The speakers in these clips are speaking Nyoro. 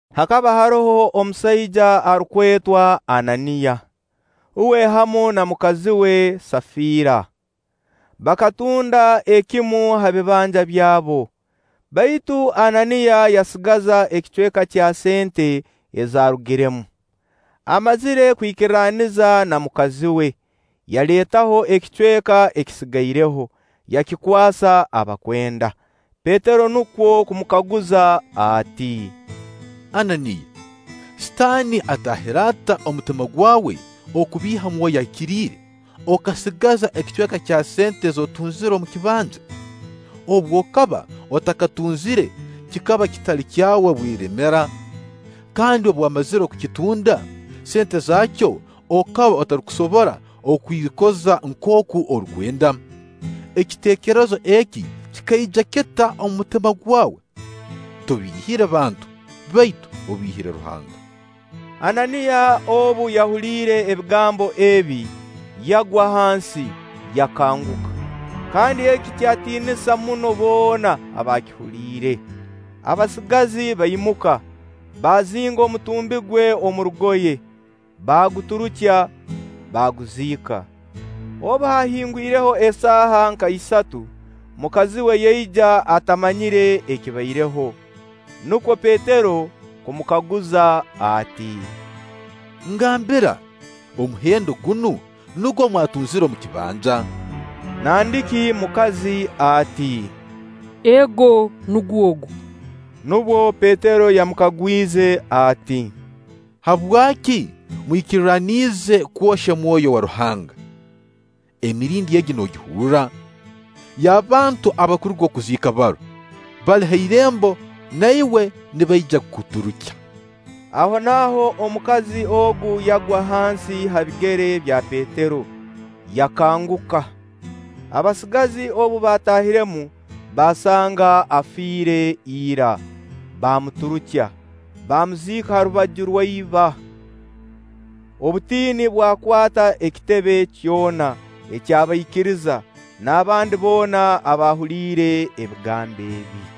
Hakaba haroho omusaija arukwetwa Ananiya. Uwe hamu na mukazi we Safiira bakatunda ekimu ha bibanja byabo. Baitu Ananiya yasigaza ekicweka kya sente ezaarugiremu, amazire kwikirraniza na mukazi we. Yaleetaho ekicweka ekisigaireho, yakikwasa abakwenda. Petero nukwo kumukaguza ati: “Ananiya, Sitaani ataahire ata omu mutima gwawe kubiiha Mwoyo Ahikiriire, okasigaza ekicweka kya sente ez'otunzire omu kibanja? Obu okaba otakakitunzire, kikaba kitali kyawe bweremera? Kandi obu wamazire kukitunda, sente zaakyo okaba otarukusobora kwikoza nkooku orukwenda? Ekiteekerezo eki kikaija kita omu mutima gwawe? Tobiihire bantu, baitu obiihire Ruhanga.” Ananiya obu yahuliire ebigambo ebi, yagwa hansi, yakanguka. Kandi eki kyatiinisa muno boona abaakihuliire. Abasigazi baimuka, baazinga omutumbi gwe omu rugoye, baaguturukya, baaguziika. Obu haahingwireho esaaha nka isatu, mukazi we yaija atamanyire ekibaireho. Nukwo Petero kumukaguza ati: “Ngambira, omuhendo gunu nugwo mwatunzire omu kibanja?” Nandiki mukazi ati: “Ego, nugwo ogu.” Nubwo Petero yamukagwize ati: “Habwaki mwikirraniize kwohya Mwoyo wa Ruhanga. Emirindi egi noogihurra? Y'abantu abarukuruga kuziika baro, bali ha irembo; na iwe nibaija kukuturukya.” Ahonaaho omukazi ogu yagwa hansi ha bigere bya Petero, yakanguka. Abasigazi obu baataahiremu, baasanga afiire ira; baamuturukya, baamuziika ha rubaju rwa iba. Obutiini bwakwata ekitebe kyona eky'abaikiriza n'abandi boona abaahuliire ebigambo ebi.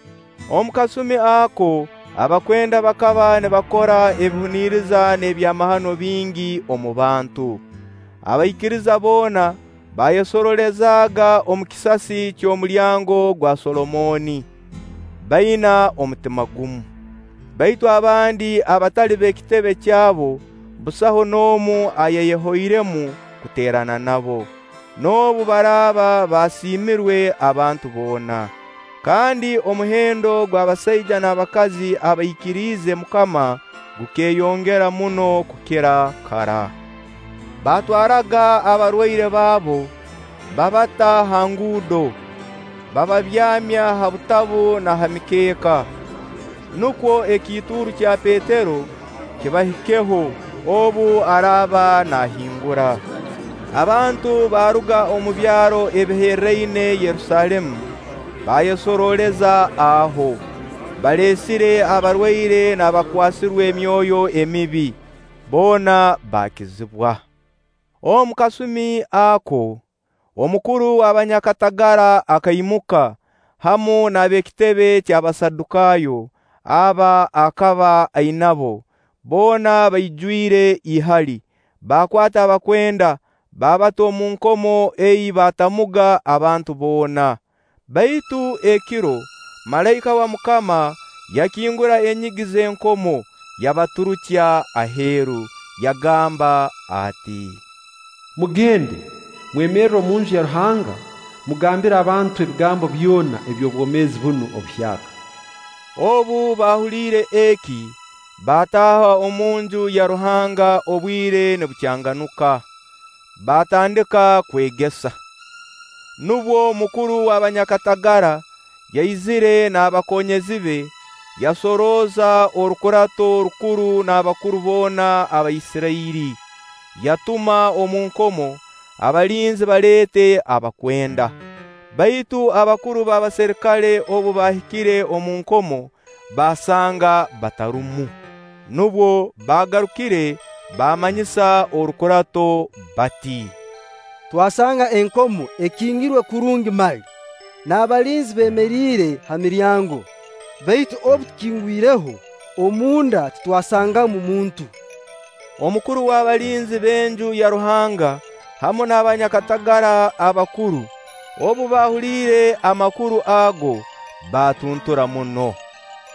Omu kasumi ako abakwenda bakaba nibakora ebihuniriza n'ebyamahano bingi omu bantu. Abaikiriza boona baayesoroolezaaga omu kisasi ky'omulyango gwa Solomooni, baina omutima gumu. Baitu abandi abatali b'ekitebe kyabo, busaho n'omu ayayehoiremu kuteerana nabo, noobu baraaba basiimirwe abantu boona. Kandi omuhendo gw'abasaija n'abakazi abaikiriize MUKAMA gukeeyongera muno kukira kara. Baatwaraaga abarwaire baabo, baabata ha nguudo, baababyamya ha butabu na ha mikeeka, nukwo ekiituuru kya Petero kibahikeho obu araaba naahingura. Abantu baaruga omu byaro ebiherraine Yerusaalemu, baayesorooleza aho, baleesire abarwaire n'abakwasirwe emyoyo emibi, boona baakizibwa. Omu kasumi ako, omukuru w'abanyakatagara akaimuka, hamu n'ab'ekitebe ky'Abasadukaayo aba akaba ainabo. Boona baijwire ihali, baakwata abakwenda, baabata omu nkomo ei baatamuga abantu boona. Baitu ekiro, malaika wa MUKAMA yakingura enyigi z'enkomo, yabaturukya aheeru, yagamba ati: “Mugende, mwemerre omunju ya Ruhanga, mugambire abantu ebigambo byona eby'obwomeezi bunu obuhyaka.” Obu baahuliire eki, baataaha omunju ya Ruhanga obwire nibukyanganyka, baatandika kwegesa. Nubwo mukuru w'abanyakatagara yaizire n'abakonyezi be, yasorooza orukurato rukuru n'abakuru boona aba Isirairi, yatuma omu nkomo, abalinzi baleete abakwenda. Baitu abakuru b'abaserikale obu baahikire omu nkomo, baasanga batarumu, nubwo baagarukire baamanyisa orukurato bati: “Twasanga enkomo ekingirwe kurungi mali, n'abalinzi beemeriire ha miryango; baitu obu tukingwireho, omunda titwasangamu muntu.” Omukuru w'abalinzi b'Enju ya Ruhanga hamu n'abanyakatagara abakuru, obu baahuliire amakuru ago, baatuntura muno,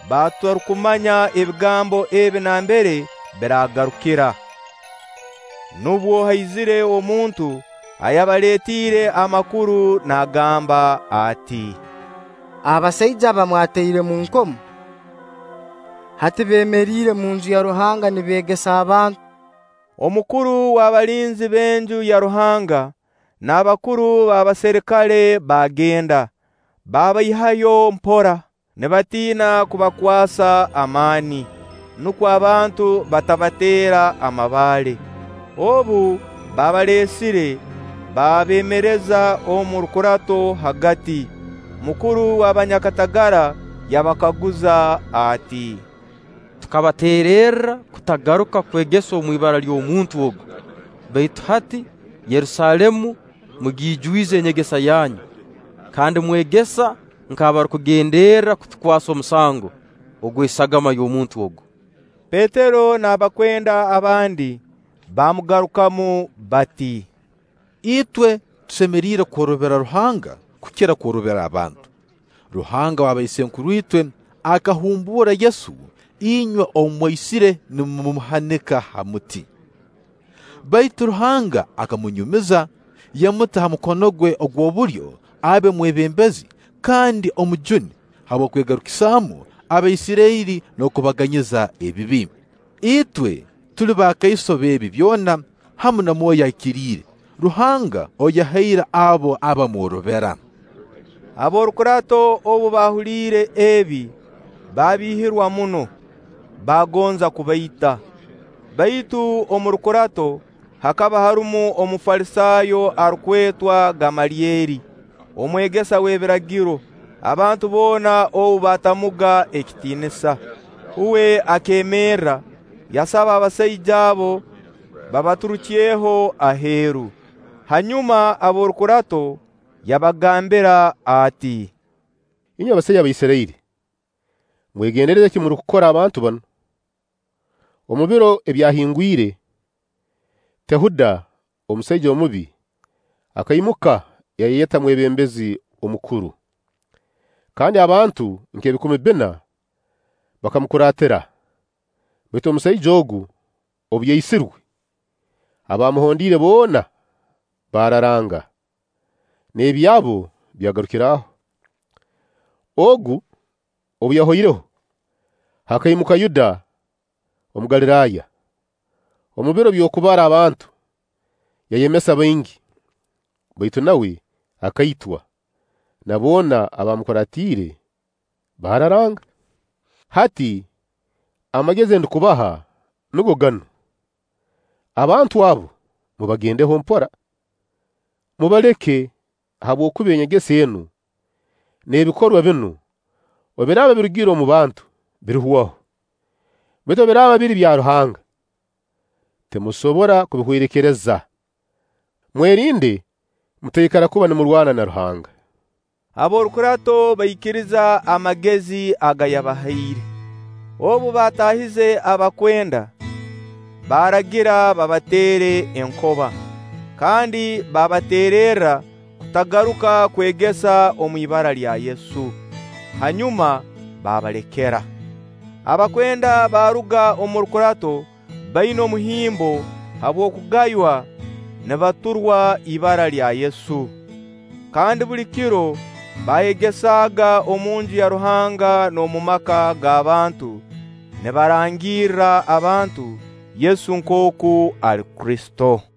batarukumanya ebigambo ebi nambere biraagarukira. Nubwo haizire omuntu ayabaleetiire amakuru naagamba ati: “Abasaija aba mwataire omu nkomo, hati beemeriire omunju ya Ruhanga nibeegesa abantu.” Omukuru w'abalinzi b'Enju ya Ruhanga n'abakuru b'abaserikale baagenda, baabaihayo mpora, nibatiina kubakwasa amaani, nukwo abantu batabateera amabaale. Obu baabaleesire, baabeemereza omu rukurato hagati, mukuru w'abanyakatagara yabakaguza ati: “Tukabateererra kutagaruka kwegesa omu ibara ly'omuntu ogu, baitu hati Yerusaalemu mugiijwize enyegesa yanyu, kandi mwegesa nk'abarukugenderra kutukwasa omusango ogw'esagama y'omuntu ogu!” Petero n'abakwenda abandi baamugarukamu bati: “Itwe tusemeriire kworobera Ruhanga kukira kworobera abantu. Ruhanga wa baisenkuruitwe akahumbuura Yesu, inywe ou mwaisire nimumuhanika ha muti. Baitu Ruhanga akamunyumiza, yamuta ha mukono gwe ogw'obulyo abe Omwebembezi kandi Omujuni, habw'okwegarukisamu Abaisirairi n'okubaganyiza ebibi. Itwe tuli bakaiso b'ebi byona, hamu na Mwoyo Ahikiriire, Ruhanga ou yahaire abo abamworobera.” Ab'orukurato obu baahuliire ebi, baabihirwa muno, baagonza kubaita. Baitu omu rukurato, hakaba harumu Omufalisaayo arukwetwa Gamalyeri, omwegesa w'ebiragiro, abantu boona ou baatamuga ekitiinisa. Uwe akeemerra, yabasaba abasaija abo babaturukyeho aheeru. Hanyuma, ab'orukurato yabagambira ati: “Inywe basaija ba Isirairi, mwegendereze eki murukukora abantu banu. Omu biro ebyahingwire, Tehuda, omusaija omubi, akaimuka yayeyeta mwebembezi omukuru, kandi abantu nk'ebikumi bbina bakamukuraatira. Baitu omusaija ogu obu yaisirwe, abaamuhondiire boona baararanga, n'ebyabo byagarukira aho. Ogu obu yahoireho, hakaimuka Yuda Omugaliraaya, omu biro by'okubara abantu, yayemesa baingi; baitu nawe akaitwa, na boona abamukuraatiire baararanga. Hati amagezi ndukubaha nugo ganu: Abantu abo mubagendeho mpora, mubaleke; habwokuba enyegesa enu n'ebikorwa binu obu biraaba birugire omu bantu, birihwaho. Baitu obu biraaba biri bya Ruhanga, timulisobora kubihwerekereza. Mwerinde mutaikara kuba nimurwana na Ruhanga!” Ab'orukurato baikiriza amagezi aga yabahaire. Obu bataahize abakwenda, baaragira babateere enkoba, kandi baabateererra kutagaruka kwegesa omu ibara lya Yesu. Hanyuma baabalekera. Abakwenda baaruga omu rukurato baina omuhimbo habw'okugaywa nibaturwa ibara lya Yesu. Kandi buli kiro baayegesaaga omunju ya Ruhanga n'omu maka g'abantu nibarangirra abantu Yesu nkooku ali Kristo.